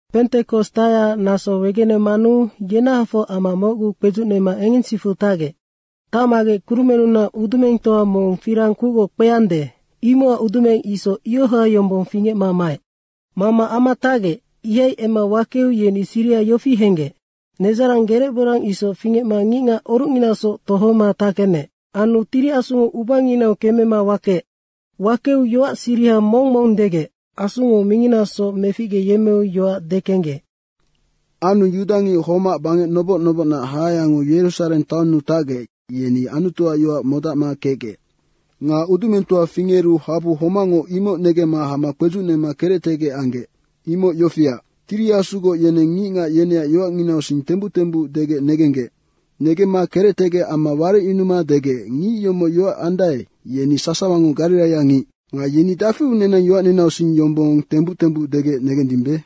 Pentekos tacyacac naso wegenemanu yenahafoc ama mocguu kpedzucnema engensicfu tacgec. Tacmagec kurumennunac udumengtoa mong firang kucgoc kpeande, imocac udumeng isoc ioha yombong fingecma maec. Mama ama tacgec, ihai emma wakeu yeni siriha yofi henggec: Nedzarang gerecborang isoc fingecma ngicngac orucnginasoc tohoma tackenec. Anu Tiri Asungo ubanginau kemema wakeec. Wakeu yoac siriha mong mong degec. Asungo minginasoc meficgeyemmeu yoac dekenggec. Anu yudangic homac bangec noboc nobocnac hahayango Yerusareng taonnu tacgec, yeni Anutuac yoac modacma kecgec. Nga udumengtoa fingeru habu homacngo imoc negemma hama kpedzucnema kerectegec anggec. Imoc yofiac, Tiri Asugoc yeneng ngicngac yeneac yoacnginausing tembuc tembuc degec negenggec. Negemma kerectegec amma warecyunuma degec, “Ngic yomoc yoac andae, yeni sasawango gariraiangic. Nga yeni dafiu nenang yoacninausing yombong tembuc tembuc degec negendimbe?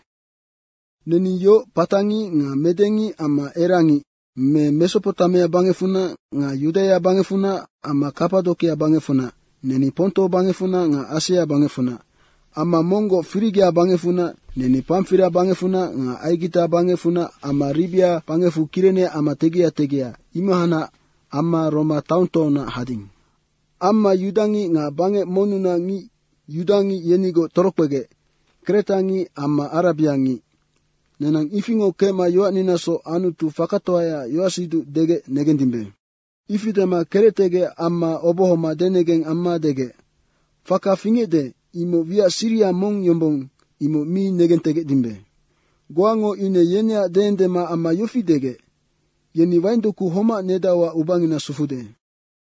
Neni yoc patangic nga medengic amma erangngic, me Mesopotamia bangecfunac nga Yudaia bangecfunac amma Kapadokia bangecfunac, neni Ponto bangecfunac nga Asia bangecfunac, amma monggoc Firigia bangecfunac, neni Pamfiria bangecfunac nga Aigita bangecfunac amma Ribia bangecfu Kirene ama tegia tegia, imohacnac amma Roma taongtoaunac hading. Amma yudangic nga bangec monnunac ngic yudangic yenigoc torokpegec, kretangic amma arabiangic. Nenang ifingoc kecma yoacninasoc Anutu fakatoayaac yoacsiduc degec negendimbe.” Ifi dema kerectegec amma obohoma denegeng amma degec, “Faka fingecde, imoc wiac siriha mong yombong, imoc mi negentegecdimbe.” Goango ine yeneac deendema amma yofi degec, “Yeni waingdoku homac nedauac ubangina sufude.”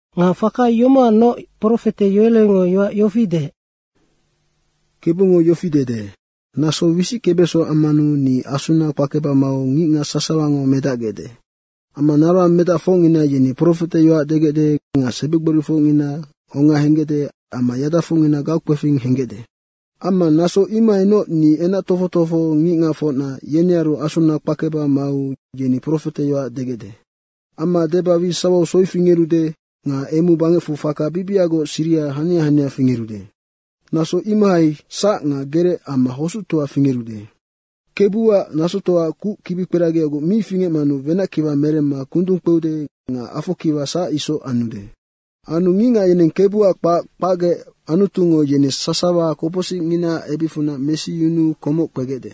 Nga faka yomocacnoc, profete Yoelengo yoac yofi deec, ‘Kebungo yofi dede, “Naso wisickebeso ammanu ni Asuna kpakeba mau ngicngac sasawango medacgecde. Amma naroang medacfocngina yeni profeteyoac degecde nga sebigborifocngina onga henggecde amma yadafocngina gaukpefing henggecde. Amma naso imohainoc ni enac tofoc tofoho ngicngacfocna, yenearu Asuna kpakeba mau yeni profeteyoac degecde. Amma deba wi sawau soi fingerude. Nga emu bangecfu faka bibiagoc siria hania hania fingerude. Naso imohai sac nga gerec amma hosuctoa fingerude. Kebuac nasotoaac kuc kibikperagiagoc mi fingecmanu wenackiwa meremma kundung kpeude nga afokiwa sac isoc anude. Anu Ngicngac yeneng KEBUAC kpac kpacgec Anutungo yeni sasawa kopocsicnginaac ebicfunac mesiyunuu komoc kpegecde.” ’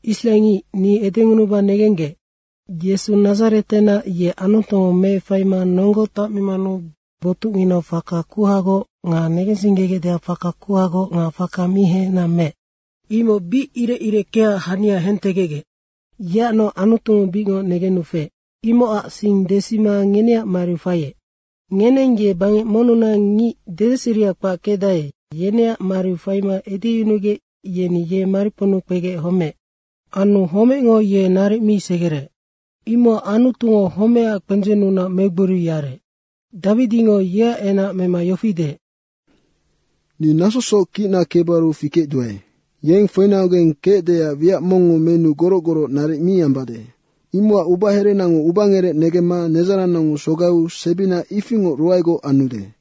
Israengic, ni edengunuba negenggec, Yesu Nadzaretenac, ye Anutungo meefaima nonggo tacmimanu botucnginau faka kuhagoc nga negensinggegecdeac faka kuhagoc nga faka mi hengena meec. Imoc bic irecireckeaac hania hentegecgec. Yeacnoc Anutungo bicngoc negenu feec, imocac sing desima ngeneac mariu faiec. Ngeneng ye bangec monnunac ngic, dedeseria kpac kecdae, yeneac mariu faima edeyunugec yeni ye mariponnu kpegec homeec. Anu homecngo ye naric mi segereec. Imocac Anutungo homecac kpendzennunac megboriu yarec. Dawidingo yeac enac mema yofi deec, ‘Ni nasosoc kicna KEBUARU fikecduae. Yeng foinaugeng kecdeac wiac mongngo menuu goroc goroc naric mi ambade. Imocac ubaherenango ubangerec negemma nedzarannango sogaiu sebina ifingoc ruaegoc anude.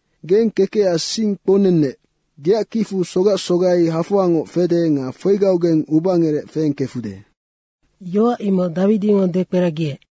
Geng kekecac sing kpounennec. Geac kicfu sogac sogai hafoangoc fede nga foigaugeng ubangerec feengkefude.’ Yoac imoc Dawidingo dekperagiec.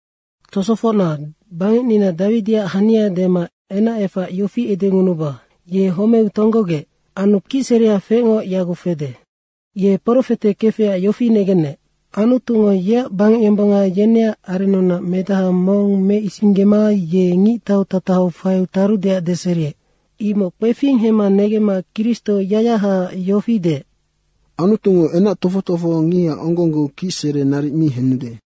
Tosofocna, bangecnina Dawidiac hania dema enacefac yofi edengunuba, ye homeu tonggogec. Anu kicserea feecngo yaguc fede. Ye profete kefecac yofi negenec, ‘Anutungo yeac bangecyombonga yeneac arennunac medaha mong meisinggema ye ngictautatahau faiu tarudeac deseriec.’ Imoc kpefing hemma negemma Kristo yacyahaac yofi deec, ‘Anutungo enac tofoc tofohongiha onggonggeu kicsere naric mi henude.’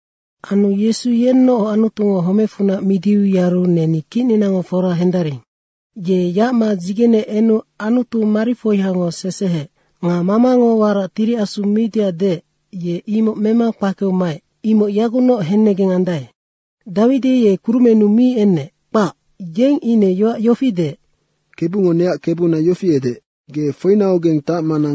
Anu Yesu yenoc Anutungo homecfunac midiu yaru neni kicninango fora hendaring. Ye yacma dzigene enu Anutu marifoiango seseheec. Nga Mamango warac Tiri Asu miudeac deec, ye imoc mema kpakeu maec, imoc yagucnoc hennegeng andae. Dawidi ye kurumennu mi enec, kpac. Yeng ine yoac yofi deec, ‘KEBUNGO neac Kebuna yofi edeec, “Ge foinaugeng tacmana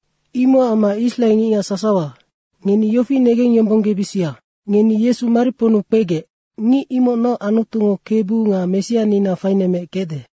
Imocac amma israengicngac sasawa, ngeni yofi negengyombonggebisia: Ngeni Yesu mariponnu kpegec, ngic imocnoc Anutungo Kebu nga Messianina fainemmeec kecde.”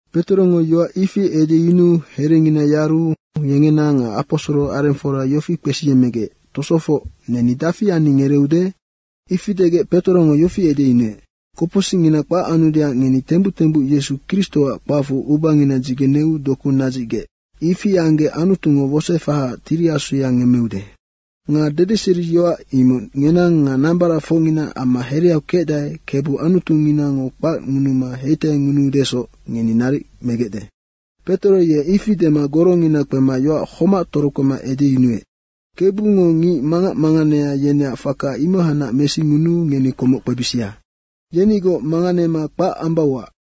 Petorongo yoac ifi edeyunuu herengina yaru, yengena nga aposoro arengfora yofi kpesiyemmegec, “Tosofoc, neni dafi anni, ngereeude?” Ifi degec Petorongo yofi edeyunuec, “Kopocsicngina kpac anudeac ngeni tembuc tembuc Yesu Kristoac kpacfu ubangina dzigeneu doku nadzicgec. Ifi anggec Anutungo wosoefahaac Tiri Asuya ngemmeude. Nga dedeseriyoac imoc ngenang nga nambaracfocngina amma hereau kecdae, Kebu Anutuninango kpacngunuma heitaingunuudesoc, ngeni naric megecde.” Petoro ye ifi dema gorongina kpema yoac homac torokpema edeyunuec, “Kebungo ngic mangac manganea yeneac faka imohacnac mesingunuu ngeni komoc kpebisia! Yenigoc manganema kpac ambauac.”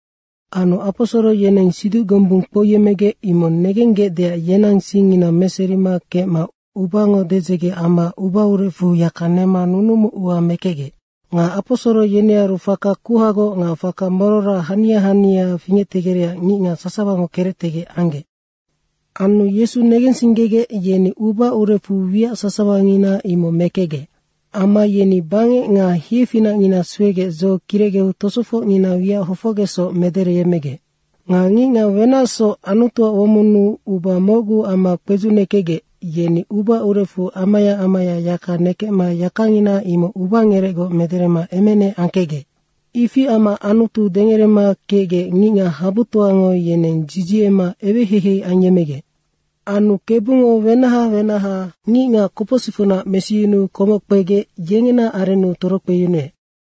Anu aposoro yeneng siduc gombung kpouyemmegec imoc negenggecdeac yenang singngina meserima kecma ubango dedzege amma uba urecfu yaka nema nunumu ua mekecgec. Nga aposoro yenearu faka kuhagoc nga faka morora hania hania fingectegerecac ngicngac sasawango kerectegec anggec. Anu Yesu negensinggegec, yeni uba urecfu wiac sasawangina imoc mekecgec. Amma yeni bangec nga hiefinacngina suegec dzo kirecgeu tosofocngina wiac hofocgecsoc medereyemmegec. Nga ngicngac wenacsoc Anutuac womonnu uba mocgu amma kpedzucnekecgec, yeni uba urecfu amaya amaya yaka nekecma yakangina imoc ubangerecgoc mederema emenec angkecgec. Ifi amma Anutu dengerema kecgec ngicngac habutoango yeneng dzidziema eweheihei ayemmegec. Anu Kebungo wenaha wenaha ngicngac kopocsicfunac mesiyunuu komoc kpegec yengena arennu torokpeyunuec.